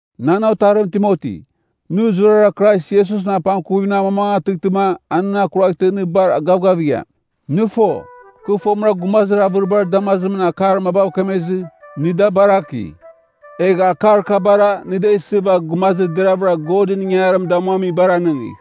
Nan otarim Timoti, nɨ zurara Krais Iesusɨn apangkuvimɨn amamangatɨghtɨma a nɨn akuraghtɨ nɨ bar gavgavigham. Nɨ fo, kɨ fomɨra gumazir avɨribar damazimɨn akar mabav kemezɨ, nɨ da baraki. Egh akar kabara nɨ da isɨva gumazir deravɨra Godɨn ingangarim damuamibar anɨngigh.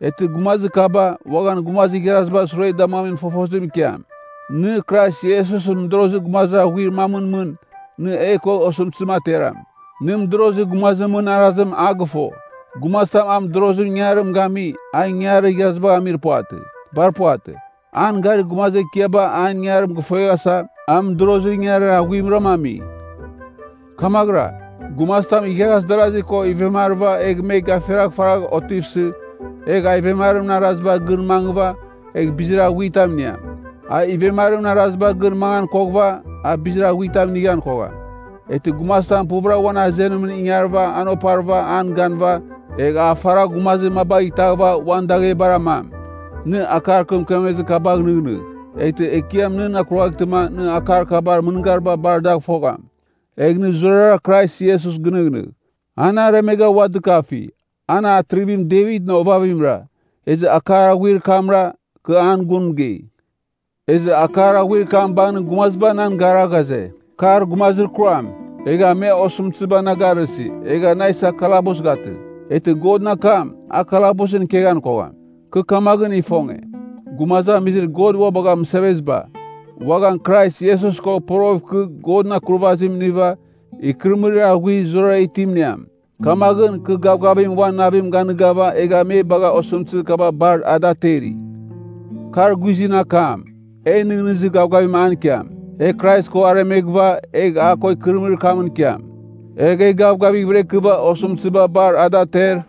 Eghtɨ gumazir kaba, uaghan gumazir igharazibar sure damuamin fofozim ikiam. Nɨ, Krais Iesusɨn mɨdorozir gumazir aghuir mamɨn mɨn, nɨ e ko osɨmtɨzim ateram. Nɨ mɨdorozir gumazimɨn arazim a gɨfo. Gumazitam a mɨdorozir ingangarim gami, a ingangarir igharazibagh amir puvatɨ. Bar puvatɨ. An garir gumazir ekiaba an ingangarim gɨfueghasa, a mɨdorozir ingangarir aghuimram ami. Kamaghɨra, gumazitam igharaz darazi ko ivemarɨva egh me gafiragh faragh otivsɨ, egh a ivemarimɨn arazibar gɨn mangɨva, egh bizir aghuitam iniam. A ivemarimɨn arazibar gɨn mangan koghɨva, a bizir aghuitam inighan kogham. Eghtɨ gumazitam puvɨra uan azenimɨn ingarɨva an oparɨva an ganɨva, egh a faragh gumazir mabagh itaghɨva uan daghebar amam. Nɨ akar kɨ mɨkemezir kabagh nɨghnɨgh, eghtɨ Ekiam nɨn akuraghtɨma nɨ akar kabar mɨngariba bar dagh fogham. Egh nɨ zurara Krais Iesus ginɨghnɨgh. An aremegha ua dɨkafi, an Atrivim Devitɨn ovavimra. Ezɨ akar aghuir kamra, kɨ an gun mɨgei. Ezɨ akar aghuir kam bangɨn gumaziba nan gara ghaze, kar gumazir kuram. Egha me osɨmtɨziba na garɨsi, egha na isa kalabus gatɨ. Eghtɨ Godɨn akam, a kalabusɨn ikeghan kogham. Kɨ kamaghɨn ifonge, gumazamizir God ua bagha mɨseveziba, uaghan Krais Iesus ko poroghɨv ikɨ Godɨn Akurvazim iniva, ikɨrɨmɨrir aghuir zurara itim iniam. Kamaghɨn, kɨ gavgavim uan navim ganɨgava egha me bagha osɨmtɨzir kaba bar ada ateri. Kar guizɨn akam, e nɨghnɨzir gavgavim an ikiam: “E Krais ko aremeghɨva, egh a ko ikɨrɨmɨrir kamɨn ikiam. Egh e gavgavighvɨra ikɨva osɨmtɨziba bar a da ater,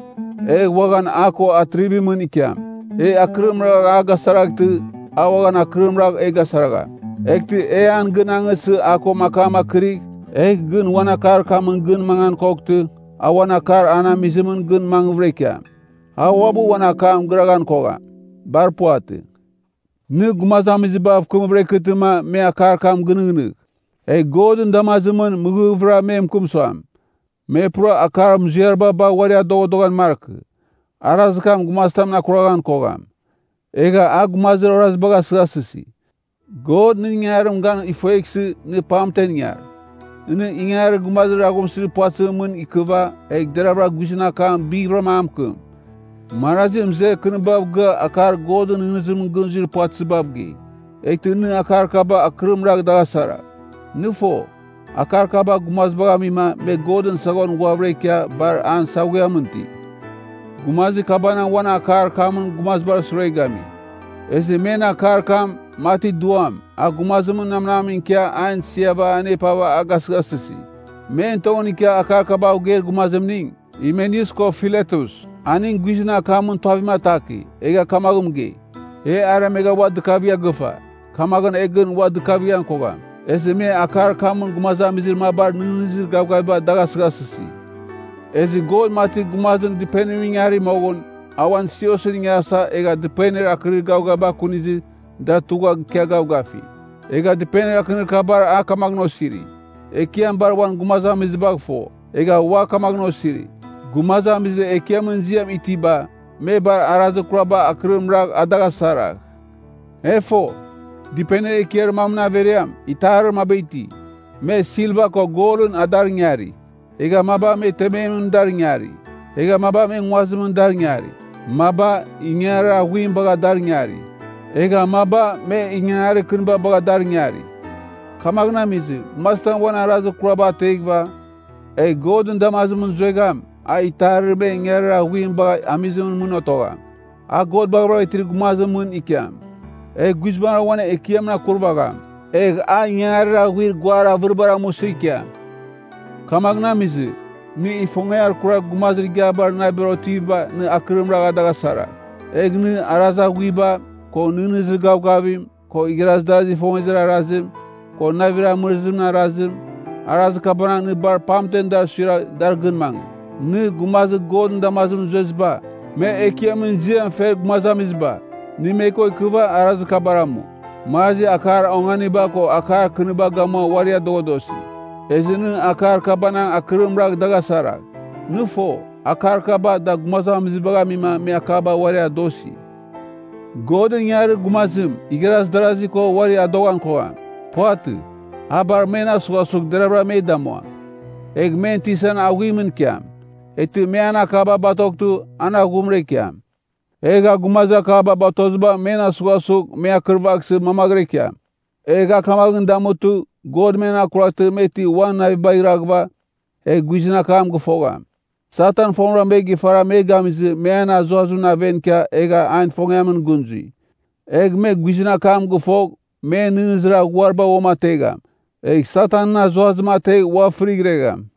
egh uaghan a ko atrivimɨn ikiam. E akɨrim ragh a gasaraghtɨ, a uaghan akɨrim ragh e gasaragham. Eghtɨ e an gɨn angɨsɨ a ko akam akɨrigh, egh gɨn uan akar kamɨn gɨn mangan koghtɨ, a uan akar an amizimɨn gɨn mangvɨra ikiam. A uabɨ uan akam gɨraghan kogham. Bar puvatɨ.” Nɨ gumazamizibav kɨmvɨra ikɨtɨma me akar kam gɨnɨghnɨgh. Egh Godɨn damazimɨn mɨghɨvɨra me mɨkɨm suam, me pura akar muziariba bagh uari adoghadoghan markɨ. Arazir kam gumazitam akuraghan kogham. Egha a gumazir orazibagh asɨghasɨsi. God nɨn ingangarim gan fueghsɨ, nɨ pamtem ingar. Nɨ ingangarir gumazir aghumsɨzir puvatɨzimɨn mɨn ikɨva, egh deravɨra guizɨn akam bighvɨrama a mɨkɨm. Marazi mɨzer kɨnibav gɨa akar Godɨn nɨghnɨzimɨn gɨn zuir puvatɨzibav gei. Eghtɨ nɨ akar kaba akɨrim ragh dagh asaragh. Nɨ fo, akar kaba gumazibagh amima me Godɨn saghon ghuavɨra ikia ghua bar an saghuiamɨn iti. Gumazir kabanang uan akar kamɨn gumazibar sure gami. Ezɨ men akar kam, mati duam, a gumazimɨn namnam ikia an isiava anepava a gasɨghasɨsi. Men tongɨn ikia akar kabav geir gumazimning, Himeneus ko Filetus. Aning guizɨn akamɨn tuavim ataki, egha kamaghɨn mɨgei, “E aremegh ua dɨkavigha gɨfa, kamaghɨn e gɨn ua dɨkavighan kogham.” Ezɨ me akar kamɨn gumazamizir mabar nɨghnɨzir gavgaviba dagh asɨghasɨsi. Ezɨ God mati gumazim dɨpenimɨn ingari moghɨn, a uan siosɨn ingarasa egha dɨpenir akɨnir gavgaviba akunizɨ da tugha ikia gavgafi. Egha dɨpenir akɨnir kabar a kamaghɨn osiri, “Ekiam bar uan gumazamizibagh fo.” Egha ua kamaghɨn osiri, “Gumazamizir Ekiamɨn ziam itiba, me bar arazir kuraba akɨrim ragh a dagh asaragh.” E fo, dɨpenir ekiar mamɨn averiam, itarir maba iti, me silva ko golɨn a dar ingari, egha maba me tememɨn dar ingari, egha maba me nguazimɨn dar ingari. Maba, ingangarir aghuim bagha dar ingari, egha maba, me ingangarir kɨniba bagha dar ingari. Kamaghɨn amizɨ, gumazitam uan arazir kuraba ateghɨva, egh Godɨn damazim zuegham, a itarir me ingangarir aghuim bagha amizimɨn mɨn otogham. A God baghavɨra itir gumazimɨn ikiam, egh guizbangɨra uan Ekiamɨn akurvagham. Egh a ingangarir aghuir guar avɨribar amusɨ ikiam. Kamaghɨn amizɨ, nɨ ifongiar kurar gumazir igiabar navibar otiviba nɨ akɨrim ragh dagh asaragh. Egh nɨ, arazir aghuiba, ko nɨghnɨzir gavgavim, ko igharazir darazir ifongezir arazim, ko navir amɨrɨzimɨn arazim, arazir kabanang nɨ bar pamtem dar suiragh dar gɨn mangɨ. Nɨ, gumazir Godɨn damazimɨn zueziba, me Ekiamɨn ziam fer gumazamiziba, nɨ me ko ikɨva arazir kabar amu. Marazi akar onganiba ko akar kɨniba gamua uari adoghadosi. Ezɨ nɨ akar kabanang akɨrim ragh dagh asaragh. Nɨ fo, akar kaba da gumazibagh amima me akaba uari adosi. Godɨn ingangarir gumazim igharaz darasi ko uari adoghan kogham. Puvatɨ, a bar men asughasugh deravɨra me damuam. Egh men tisan aghuimɨn ikiam. Eghtɨ me an akaba batoghtɨ, an aghumra ikiam. Egh a gumazir akaba batoziba men asughasugh me akɨrvaghsɨ mangvɨra ikiam. Egh a kamaghɨn damutɨ, God men akuraghtɨ me ti uan navibagh iraghɨva, egh guizɨn akam gɨfogham. Satan fomɨra me gifara me gamizɨ me an azuazimɨn aven ikia egha an ifongiamɨn gɨn zui. Egh me guizɨn akam gɨfogh, men nɨghnɨzir aghuariba uamategham, egh Satanɨn azuazim ategh ua fɨrighregham.